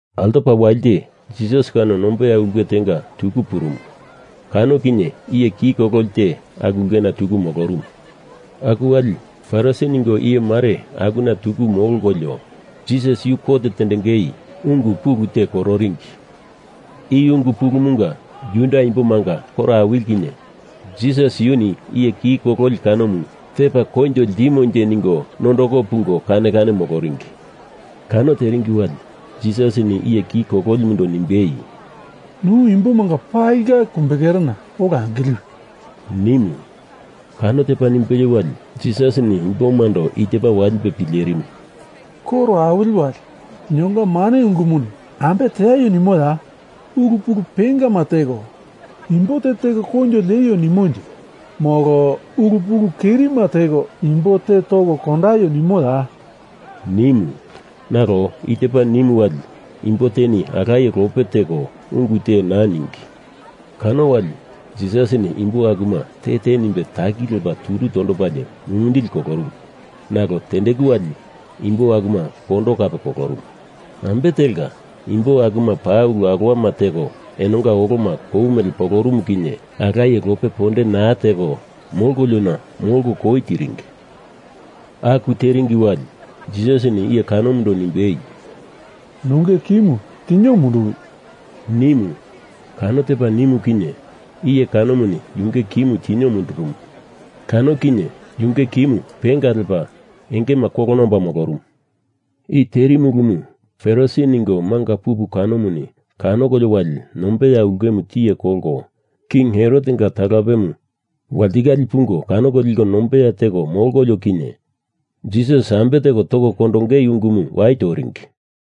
Altopa walite Jisas kano nombeya ulke tenga tuku purumu. Kano kinye iye ki kololi te aku ulkena tuku molorumu. Aku wali Farisi ningo iyemare akuna tuku molkolio Jisas yu kot tendengei ungu pulu te kororingi. I ungu pulumunga Juda imbomanga koro awili kinye Jisas yuni iye ki kololi kanomu tepa koinjo ltimonje ningo nondoko pungo kane kane moloringi. Kano teringi wali Jisasini iye ki kololimundo nimbei, “Nu imbomanga palinga kumbekerena ola angiliwi,” nimu. Kano tepa nimbelie wali Jisasini imbomando i tepa walipe pilerimu, “Koro awili wali linonga mane ungumuni ambe teaio nimoya? Ulu pulu pengama teko imbo te teko koinjo lieio nimonje molo ulu pulu kerima teko imbo te toko kondaio nimoya?” nimu. Nalo i tepa nimu wali imbo teni alaye lope teko ungu te naa ningi. Kano wali Jisasini imbo akuma te te nimbe taki lepa turu tondopalie mumindili kolorumu nalo tendeku wali imbo akuma kondo kape kolorumu. Ambe telka imbo akuma paa ulu alowamu teko enonga oloma kou mele polorumu kinye alaye lope ponde naa teko molkona molko koi tiringi. Aku tiringi wali Jisasini iye kanomundo nimbei, “Nunge kimu tinio munduwi,” nimu. Kano tepa nimu kinye, iye kanomuni yunge kimu tinio mundurumu. Kano kinye yunge kimu penga lepa engema kolona omba molorumu. I terimu ulumu Farisi ningo manga pupu kanomuni kanokolio wali nombeya ulkemu tiye kolko King Herotenga talapemu walitikale pungo kanoko liko nombeya teko molkolio kinye Jisas ambe teko toko kondongei ungumu wai toringi.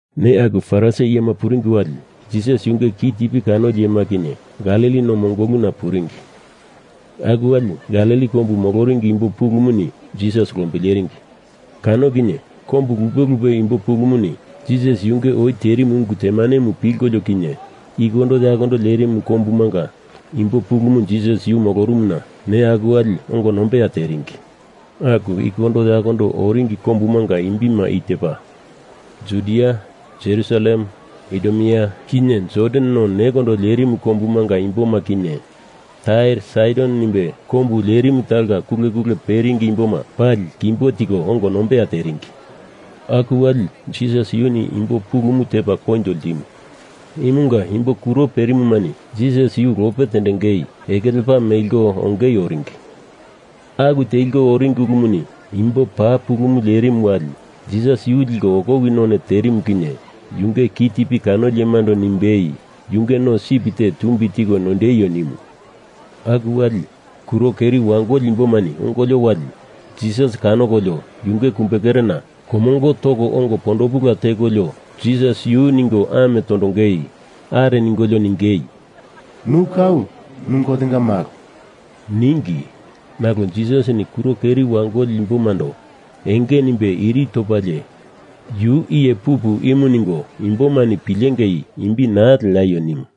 Neya aku Farisi iyema puringi wali Jisas yunge kitipi kanoli iyema kinye Galili no mongolumu puringi. Aku wali Galili kombu moloringi imbo pulumuni Jisas lombileringi. Kano kinye kombu lupe lupe imbo pulumuni Jisas yunge oi terimu ungu temanemu pilkolio kinye ikondo yakondo lerimu kombumanga imbo pulumu Jisas yu molorumuna neya aku wali ongo nombeya teringi. Aku ikondo yakondo oringi kombumanga imbima i tepa Judia, Jerusalem, Idumea, kinye Jordan no nekondo lerimu kombumanga imboma kinye Tair Saidon nimbe kombu lerimu talonga kule kule peringi imboma pali kimbo tiko ongo nombeya teringi. Aku wali Jisas yuni imbo pulumu tepa koinjo ltimu. Imunga imbo kuro perimumani Jisas yu lope tendengei eke lepa meliko ongei oringi. Aku teliko oringi ulumuni imbo paa pulumu lerimu wali Jisas yu liko okowi none terimu kinye yunge kitipi kanoli iyemando nimbei yunge no sip te tumbi tiko noindeio nimu. Aku wali kuro keri wangoli imbomani ongolio wali Jisas kanokolio yunge kumbekerena komongo toko ongo pondopula tekolio Jisas yu ningo ame tondongei are ningolio ningei, “Nu kau nu Gotenga malo,” ningi. Nalo Jisasini kuro keri wangoli imbomando enge nimbe iri topalie yu iye pupu imu ningo imbomani pilengei imbi naa leaio nimu.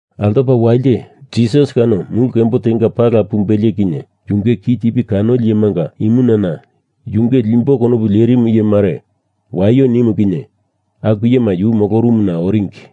Altopa walite Jisas kano mulu kembo tenga pala pumbelie kinye yunge kitipi kanoli iyemanga imunana yunge limbo konopu lerimu iyemare waio nimu kinye aku iyema yu molorumuna oringi.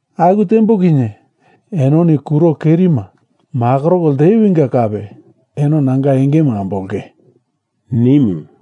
Aku tembo kinye enoni kuro kerima makoroko ltewinga kape eno nanga engemu ambolonge,” nimu.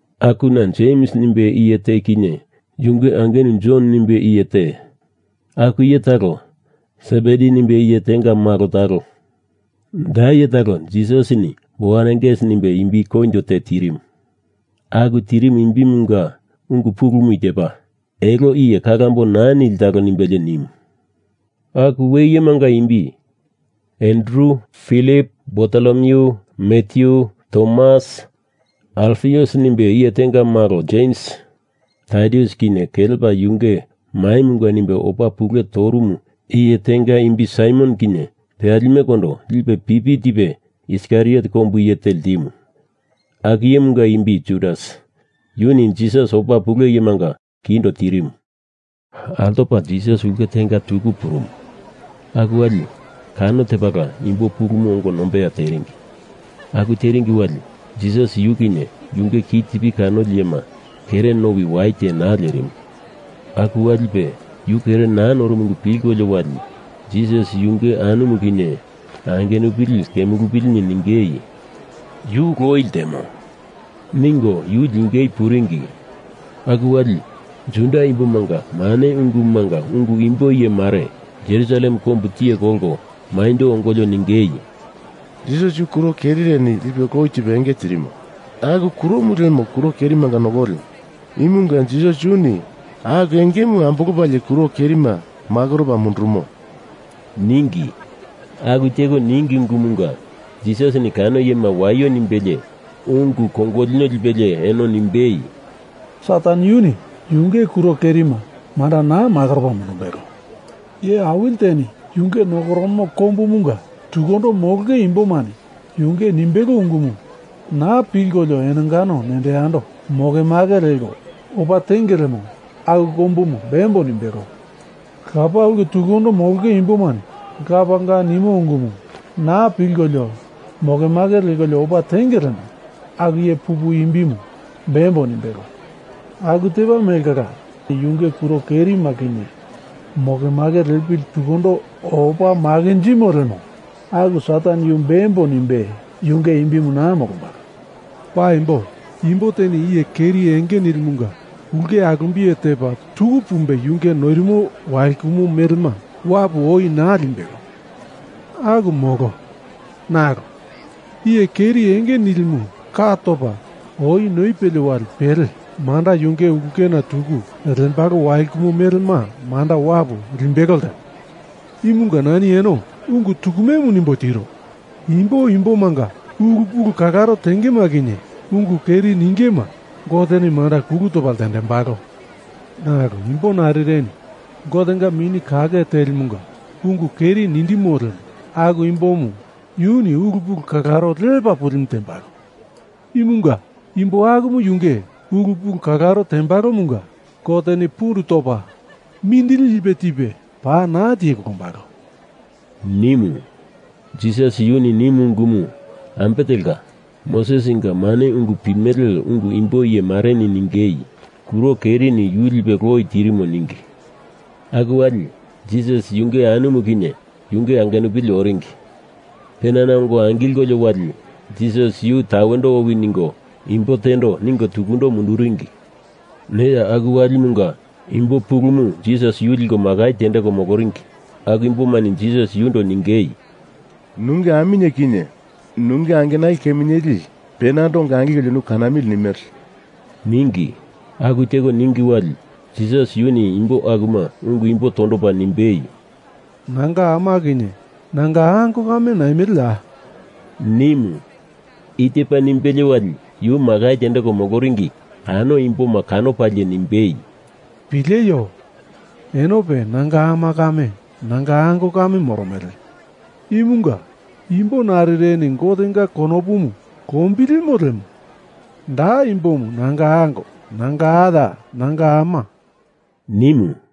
Akuna Jems nimbe iye te kinye yunge angenu Jon nimbe iye te, aku iye talo Sebedi nimbe iye tenga malo talo. Da iye talo Jisasini Boanerges nimbe imbi koinjo te tirimu. Aku tirimu imbimunga ungu pulumu i tepa, elo iye kalambo naa nili talo nimbelie nimu. Aku we iyemanga imbi Andru, filip, Bartolomyu, Matyu, Tomas, Alfius nimbe iye tenga malo Jems, Tadius kinye kelepa yunge maimunga nimbe oi opa pule torumu iye te imbi Saimon kinye peyalimekondo lipe pipi tipe Iskariot kombu iye te ltimu. Aku iyemunga imbi Judas yuni Jisas opa pule iyemanga kindo tirimu. Altopa Jisas ulke tenga tuku purumu. Aku wali kano tepala imbo pulumu ongo nombeya teringi. Aku teringi wali Jisas yu kinye yunge kitipi kanoli iyema kere nowi wai te naa lerimu. Aku walipe yu kere naa norumu ungu pilkolio wali Jisas yunge anumu kinye angenupili kemulupilini ningei “Yu loi ltemo,” ningo yu lingei puringi. Aku wali Juda imbomanga mane ungumunga ungu imbo iyemare Jerusalem kombu tiye kolko maindo ongolio ningei, “Jisas yu kuro kerireni lipe loi tipe enge tirimo. Aku kuromu lemo kuro kerimanga nokolimu. Imunga Jisas yuni aku engemu ambolopalie kuro kerima makoropa mundurumo,” ningi. Aku teko ningi ungumunga Jisasini kano iyema waio nimbelie ungu kongolino lipelie eno nimbei, “Satan yuni yunge kuro kerima manda naa makoropa mundumbelo. Iye awili teni yunge nokoromo kombumunga tukundo molonge imbomani yunge nimbelo ungumu naa pilkolio enongano nendo yando mokemake lekolio opa tenge lemo aku kombumu bembo nimbelo. Lapa ulke tukundo molonge imbomani lapanga nimo ungumu naa pilkolio mokemake lekolio opa tenge lemo aku iye pupu imbimu bembo nimbelo. Aku tepa mele kala Sataneni yunge kuro kerima kinye mokemake lepalie tukundo opa makinjimo lemo aku Satan yu bembo nimbe yunge imbimu naa molombalo. Paimbo, imbo teni iye keri enge nilimunga ulke alumbiye tepa tuku pumbe yunge noirimo walkumo melema wapu oi naa limbelo. Aku molo. Nalo iye keri enge nilimu ka topa oi noipelie wali pele manda yunge ulkena tuku lembalo walkumo melema manda wapu limbelo ltemo. Imunga nani eno ungu tukumemu nimbo tiro. Imbo imbomanga ulu pulu kalaro tengema kinye ungu keri ningema Goteni manda kulu topa ltendembalo. Nalo imbo narireni Gotenga Mini Kake Telimunga ungu keri nindimo lemo aku imbomu yuni ulu pulu kalaro lepa pulimu tembalo. Imunga imbo akumu yunge ulu pulu kalaro tembalomunga Goteni pundu topa mindili lipe tipe paa naa tiye kondombalo,” nimu. Jisas yuni i nimu ungumu ambe telka Mosesinga mane ungu pimele ungu imbo iye mareni ningei kuro kerireni yu lipe loi tirimo ningi. Aku wali Jisas yunge anumu kinye yunge angenupili oringi. Penana ongo angilkolio wali Jisas yu tawendo owi ningo imbo tendo ningo tukundo munduringi. Neya aku walimunga imbo pulumu Jisas yu liko makai tendeko moloringi aku imbomani Jisas yundo ningei, “Nunge aminye kinye nunge angenali keminyeli penando ongo angilkolio nu kanamili nimele,” ningi. Aku teko ningi wali Jisas yuni imbo akuma ungu imbo tondopa nimbei, “Nanga ama kinye nanga ango kame naimeleya?” nimu. I tepa nimbelie wali yu makai tendeko moloringi kano imboma kanopalie nimbei, “Pileio! Enope nanga ama kame nanga ango kame moromele. Imunga imbo narireni Gotenga konopumu lombilimo lemo da imbomu nanga ango, nanga aya, nanga ama,” nimu.